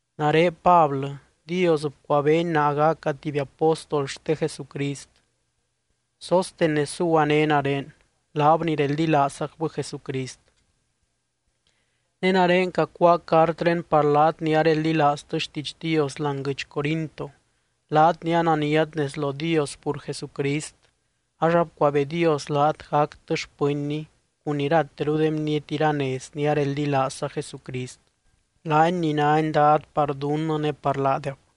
Nare Pablɨ, Dios bcuabeeny naa gaca tuby apóstol xte Jesucrist. Sóstenes zuguané nare, laab ni reldilaazzacbɨ Jesucrist. Ne nare cacuáa cartré par laat ni areldilaaztɨ xtiidx Dios láani guɨdx Corinto, laat ni ananiat nez lo Dios pur Jesucrist, ax abcuabee Dios laat gactɨ xpɨnny cun irateru de bniety iranez ni areldilaazza Jesucrist, laany ni nány Dad par dunnɨ ne par laadeb.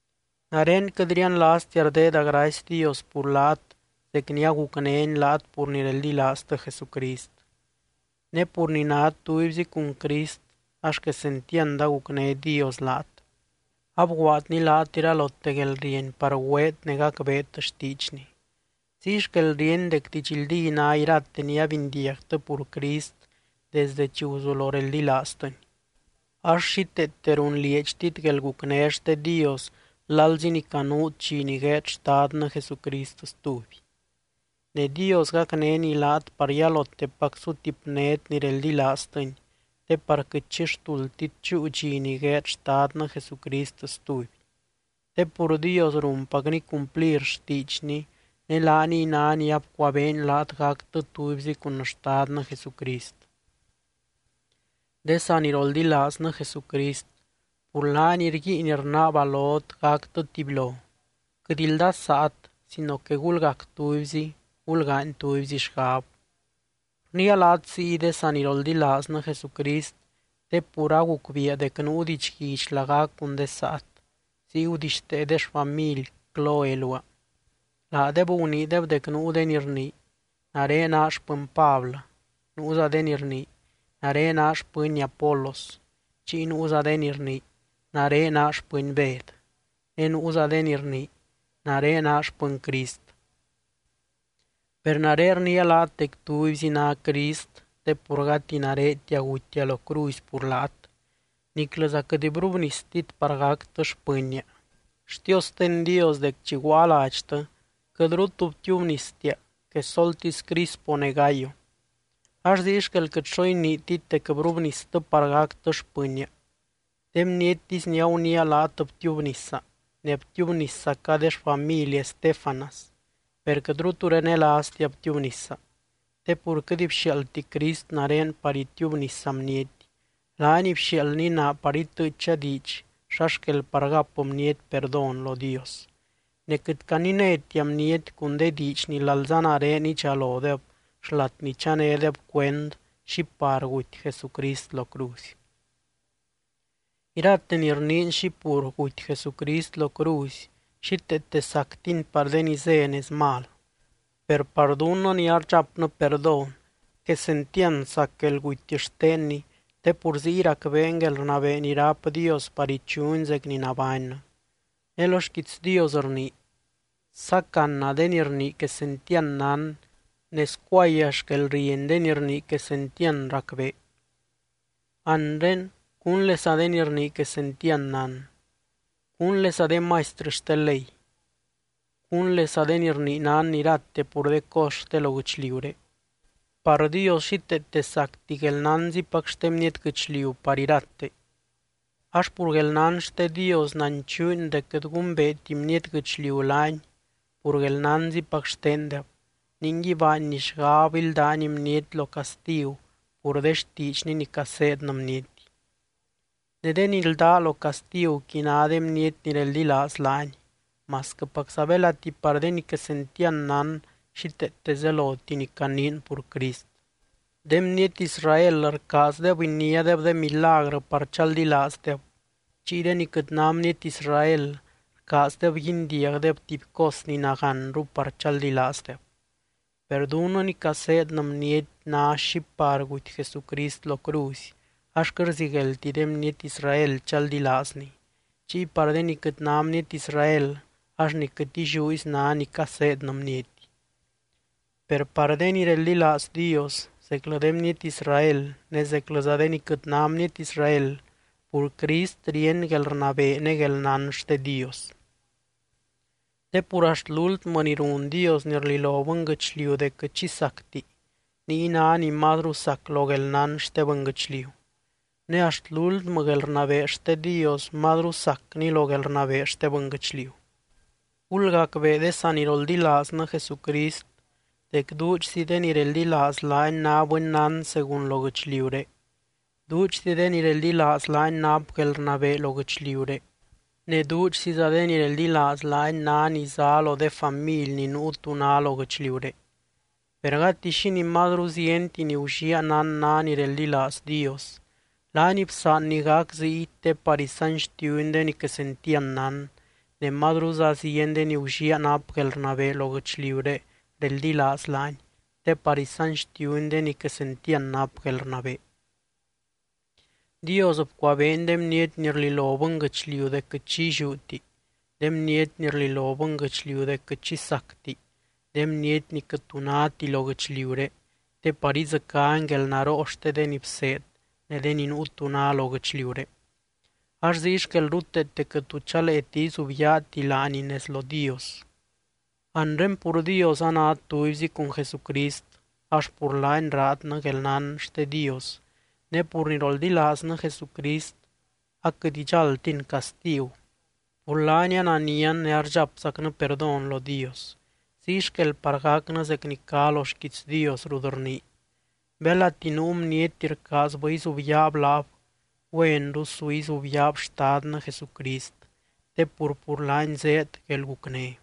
Nare quɨt rianlaaztia rdeeda gracy Dios pur laat zec ni agucnény laat pur ni reldilaaztɨ Jesucrist. Ne pur ni nát tubyzi cun Crist ax quesentiand agucné Dios laat, abguaadny laat iralote guelrieny par güeet ne gacbeet xtiidxny. Ziy xquel ríeny dec didxldí ná irate ni abindiagtɨ pur Crist desde chi guzulo reldilaaztɨny. Ax xíteete runlieedxtit guelgucné xte Dios lalzi ni canuut dxi ni gueed Xtadnɨ Jesucrist stuby. Ne Dios gacnény laat par yalotepac sutipnét ni reldilaaztɨny, te par quɨt xi xtuldtit chúu dxi ni gueed Xtadnɨ Jesucrist stuby. Te pur Dios runpacny cumplir xtiidxny, ne laaniy ná ni abcuabeeny laat gactɨ tubyzi cun Xtadnɨ Jesucrist. De saniroldilaaznɨ Jesucrist, pur laany rguiin rnaaba lot gactɨ tubylo, quɨt ldasaat sino que gulgac tubyzi, gulgaany tubyzi xgab. Rniia laat ziy de saniroldilaaznɨ Jesucrist, te pur agucbiia dec nuu didxguidx lagac cun de saat, ziy gudixtee de xfamily Cloe luaa. Laadeb guniideb dec nuu de ni rnii: “Nare naa xpɨny Pablɨ”, nuuza de ni rnii: “Nare naa xpɨny Apolos”, chiy nuuza de ni rnii: “Nare naa xpɨny Bed”, ne nuuza de ni rnii: “Nare naa xpɨny Crist.” Per nare rniia laat dec tubyzi ná Crist te pur gati naretia gutia lo cruzy pur laat, niclɨza quɨt brubnistit par gactɨ xpɨnnia. Xtiosten Dios dec chi guaa ladxtɨ, quɨtru tu btiubnistia quesoltisy Crispo ne Gayo. Ax ziy xquel quɨt xo iniitit dec brubnistɨ par gactɨ xpɨnnia. De bniettisy ni aguniia laat btiubnisa, ne btiubniszaca de xfamily Estéfanas, per quɨtru tu renelaaztia btiubnisa. Te pur quɨt bxiaaldti Crist nare par itiubnisa bniety, laany bxiaaldny naa par itɨɨcha diidx xa xquel par gap bniety perdón lo Dios. Ne quɨt caninétia bniety cun de diidx ni lalza nare idxalodeb xlat ni chanédeb cuend xi par guty Jesucrist lo cruzy. Irate ni rniin xi pur guty Jesucrist lo cruzy, xíteete sactini par de ni zé nez mal. Per par dunnɨ ni ardxapnɨ perdón, quesentiand sac guelguty xtenny te pur ziy racbeen guelrnabee ni ráp Dios par ichuny zec ni nabánnɨ. Ne lo xquiits Dios rnii: Sácana de ni rnii quesentiand nán ne scuaya xquelrieny de ni rnii quesentiand racbee. Anre, ¿cúnlesa de ni rnii quesentiand nán? ¿Cúnlesa de maistrɨ xte ley? ¿Cúnlesa de ni rnii nán irate pur de cos xte lo guɨchliuré? Par Dios xíteete sacti guelnánzipac xte bniety guɨchliu par irate. Ax pur guelnán xte Dios nanchuuny dec quɨt gumbeeti bniety guɨchliu laany pur guelnánzipac xtendeb, ningui baanny xgab íldany bniety lo castigu pur de xtiidxny ni caseednɨ bniety. Ne de ni ldá lo castiguqui ná de bniety ni reldilaaz laany, masquɨpacza belati par de ni quesentiand nán xíteete zeloti ni caniin pur Crist. De bniety Israel rcaazdeb iniádeb de milagrɨ par chaldilaazdeb, chiy de ni quɨt ná bniety Israel rcaazdeb guindiagdeb tuby cos ni nagánru par chaldilaazdeb. Per dunnɨ ni caseednɨ bniety ná xi par guty Jesucrist lo cruzy, ax quɨt rzigueldti de bniety Israel chaldilaazny, chiy par de ni quɨt ná bniety Israel ax ni quɨt illiúzy ná ni caseednɨ bniety. Per par de ni reldilaaz Dios, zeclɨ de bniety Israel ne zeclɨza de ni quɨt ná bniety Israel, pur Crist ríeny guelrnabee ne guelnán xte Dios. Te pur axt lúltmɨ ni run Dios ni rlilo bɨnguɨchliu dec quɨt xi sacti, niy ná ni mazru sac lo guelnán xte bɨnguɨchliu. Ne axt lúltmɨ guelrnabee xte Dios mazru sacni lo guelrnabee xte bɨnguɨchliu. Gulgacbee de saniroldilaaznɨ Jesucrist dec duudxzi de ni reldilaaz laany ná bɨnnán según lo guɨchliuré, duudxzi de ni reldilaaz laany nap guelrnabee lo guɨchliuré, ne duudxziza de ni reldilaaz laany ná ni zá lo de family ni nuu tu ná lo guɨchliuré. Per gati xínii mazru zienti ni gulliaa nán ná ni reldilaaz Dios, laany bsaanny gac ziy te par isanxtiuny de ni quesentiand nán, ne mazruza zieny de ni gulliaa nap guelrnabee lo guɨchliuré reldilaaz laany te par isanxtiuny de ni quesentiand nap guelrnabee. Dios bcuabeeny de bniety ni rlilo bɨnguɨchliu dec quɨt xi illiúti, de bniety ni rlilo bɨnguɨchliu dec quɨt xi sacti, de bniety ni quɨt tu náti lo guɨchliuré te par idzɨcány guelnaroo xte de ni bseed, de ni nuu tu ná lo guɨchliuré. Ax ziy xquel ruteete quɨt tu chaleeti izubyaati laani nez lo Dios. Anre pur Dios anát tubyzi cun Jesucrist, ax pur laany raadnɨ guelnán xte Dios. Ne pur ni roldilaaznɨ Jesucrist aquɨt idxáldtin castigu, pur laany ananian ne ardxapzacnɨ perdón lo Dios. Ziy xquel par gac zec ni cá lo xquiits Dios rut rnii: Belati nuu bniety rcaazbɨ izubyaab laab, güenru su izubyaab Xtadnɨ Jesucrist te pur, pur laany zéed guelgucné.